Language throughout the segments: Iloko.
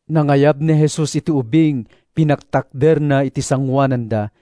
Nangayab ni Jesus iti ubing, pinagtakderna iti sangoananda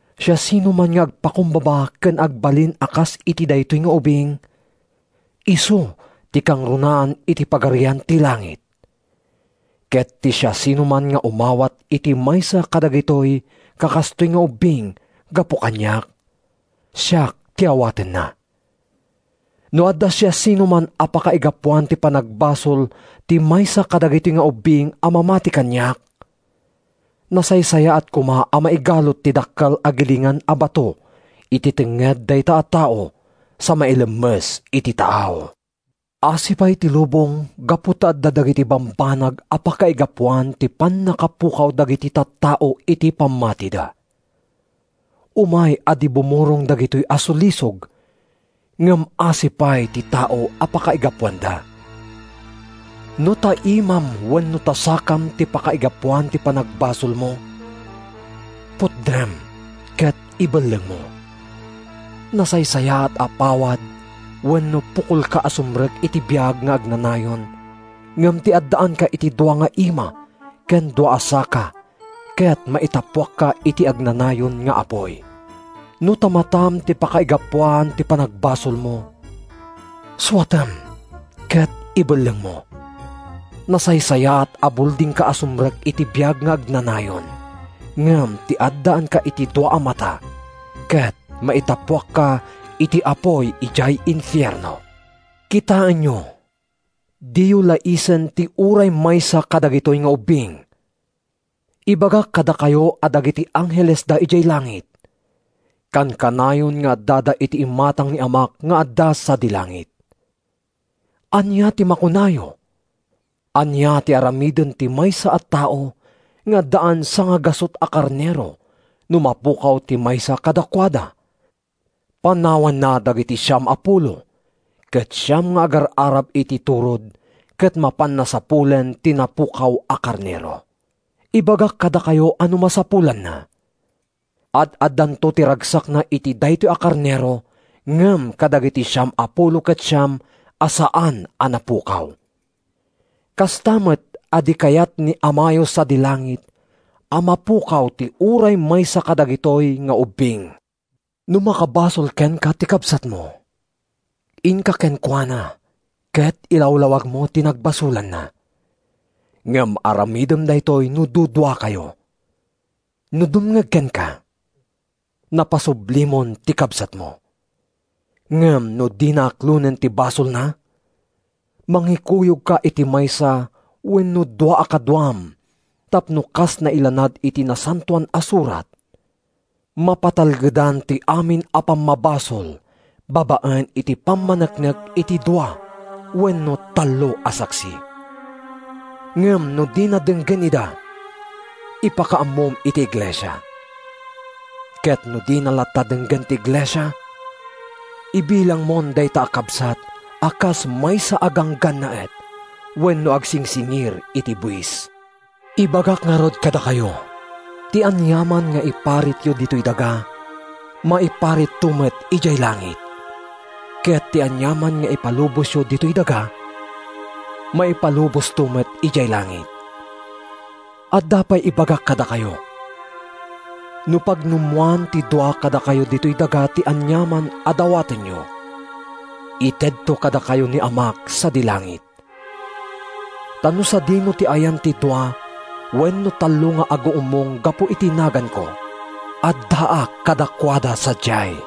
Siasinoman nga agpakumbaba ken agbalin a kas iti daytoy nga ubing, isu ti kangrunaan iti Pagarian ti Langit. Ket ti siasinoman nga umawat iti maysa kadagiti kakastoy nga ubbing gapu kaniak, siak ti awatenna.” “No adda siasinoman a pakaigapuan ti panagbasol ti maysa kadagitoy nga ubbing a mamati kaniak, nasaysayaat koma a maigalut ti dakkel a gilingan a bato iti tengnged dayta a tao sa mailemmes iti taaw. Asi pay ti lubong gapu ta adda dagiti bambanag a pakaigapuan ti pannakapukaw dagiti tattao iti pammatida! Umay a di bumurong dagitoy a sulisog, ngem asi pay ti tao a pakaigapuanda! “No ta imam wenno ta sakam ti pakaigapuan ti panagbasolmo, putdem ket ibellengmo! Nasaysayaat a pawad wenno pukolka a sumrek iti biag nga agnanayon ngem ti addaanka iti dua nga ima ken dua a saka ket maitappuakka iti agnanayon nga apuy. No ta matam ti pakaigapuan ti panagbasolmo, suatem ket ibellengmo! Nasaysayaat a buldingka a sumrek iti biag nga agnanayon ngem ti addaanka iti dua a mata ket maitappuakka iti apuy idiay infierno.” “Kitaenyo diyo laisen ti uray maysa kadagitoy nga ubbing. Ibagak kadakayo a dagiti anghelesda idiay langit, kankanayon nga addada iti imatang ni Amak nga adda sadi langit. “Ania ti makunayo? Ania ti aramiden ti maysa a tao nga addaan sangagasut a karnero no mapukaw ti maysa kadakuada? Panawanna dagiti siam a pulo ket siam nga agar-arab iti turod ket mapanna sapulen ti napukaw a karnero. Ibagak kadakayo a no masapulanna, ad-addanto ti ragsakna iti daytoy a karnero ngem kadagiti siam a pulo ket siam a saan a napukaw. Kasta met a di kayat ni Amayo sadi langit a mapukaw ti uray maysa kadagitoy nga ubbing.” “No makabasol kenka ti kabsatmo, inka kenkuana ket ilawlawagmo ti nagbasolanna. Ngem aramidem daytoy no duduakayo. No dumngeg kenka, napasublimon ti kabsatmo. Ngem no dina aklonen ti basolna, mangikuyogka iti maysa wenno dua a kaduam tapno, kas nailanad iti Nasantoan a Surat, ‘Mapatalgedan ti amin a pammabasol babaen iti pammaneknek ti dua wenno tallo a saksi.’ Ngem no dina denggen ida, ipakaammom iti iglesia. Ket no dina latta denggen ti iglesia, ibilangmon dayta a kabsat a kas maysa a ganggannaet wenno agsingsingir iti buis.” “Ibagak ngarud kadakayo: Ti aniaman nga iparityo ditoy daga, maiparitto met idiay langit; ket ti aniaman nga ipalubosyo ditoy daga, maipalubosto met idiay langit. “Adda pay ibagak kadakayo: No pagnummoan ti dua kadakayo ditoy daga ti aniaman a dawatenyo, itedto kadakayo ni Amak sadi langit. Ta no sadino ti ayan ti dua wenno tallo nga aguummong gapu iti naganko, addaak kaduada sadiay.”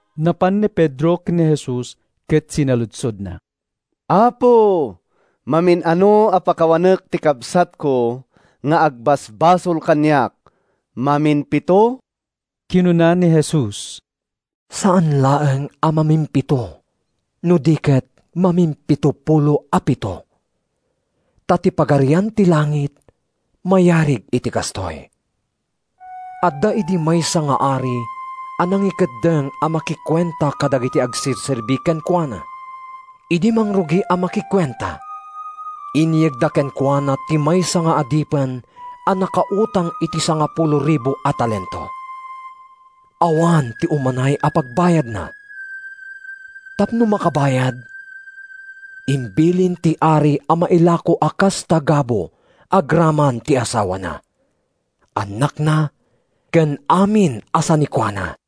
Napan ni Pedro ken ni Jesus ket sinaludsodna, “Apo, mamin-ano a pakawanek ti kabsatko nga agbasbasol kaniak? Mamimpito?” Kinuna ni Jesus, “Saan laeng a mamimpito no di ket mamimpitopulo a pito. Ta ti Pagarian ti Langit mayarig iti kastoy: Adda idi maysa nga ari a nangikeddeng a makikuenta kadagiti agserserbi kenkuana. Idi mangrugi a makikuenta, inyegda kenkuana ti maysa nga adipen a nakautang iti sangapulo ribu a talento. Awan ti umanay a pagbayadna. Tapno makabayad, imbilin ti ari a mailako a kas tagabu agraman ti asawana, annakna ken amin a sanikuana.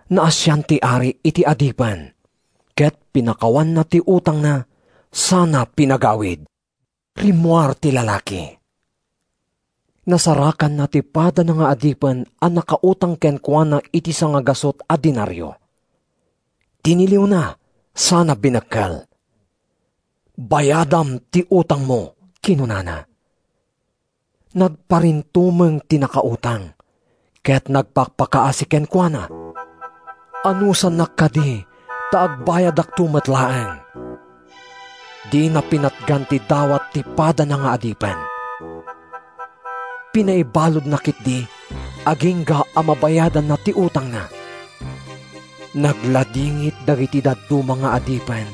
“Naasian ti ari iti adipen ket pinakawanna ti utangna sana pinagawid. “Rimmuar ti lalaki. Nasarakanna ti padana nga adipen a nakautang kenkuana iti sangagasut a denario. Tiniliwna sana binekkel. ‘Bayadam ti utangmo,’ kinunana. “Nagparintumeng ti nakautang, ket nagpakpakaasi kenkuana, ‘Anusannak kadi ta agbayadakto met laeng.’ “Dina pinatgan ti dawat ti padana nga adipen. Pinaibaludna ketdi agingga a mabayadanna ti utangna. “Nagladingit dagiti dadduma nga adipen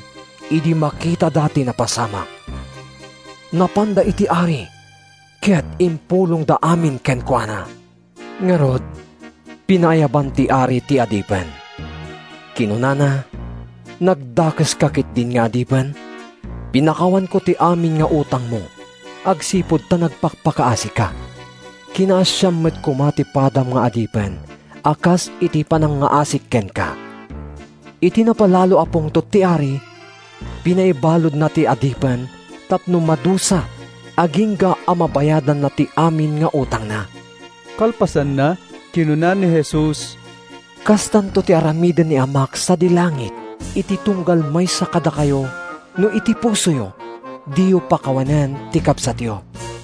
idi makitada ti napasamak. Napanda iti ari ket impulongda amin kenkuana. “Ngarud, pinaayaban ti ari ti adipen. Kinunana, ‘Nagdakeska ketdin nga adipen! Pinakawanko ti amin nga utangmo agsipud ta nagpakpakaasika. Kinaasiam met koma ti padam nga adipen a kas iti panangngaasik kenka.’ “Iti napalalo a pungtot ti ari, pinaibaludna ti adipen tapno madusa agingga a mabayadanna ti amin nga utangna.” Kalpasanna, kinuna ni Jesus, “Kastanto ti aramiden ni Amak sadi langit iti tunggal maysa kadakayo no iti pusoyo, diyo pakawanen ti kabsatyo.”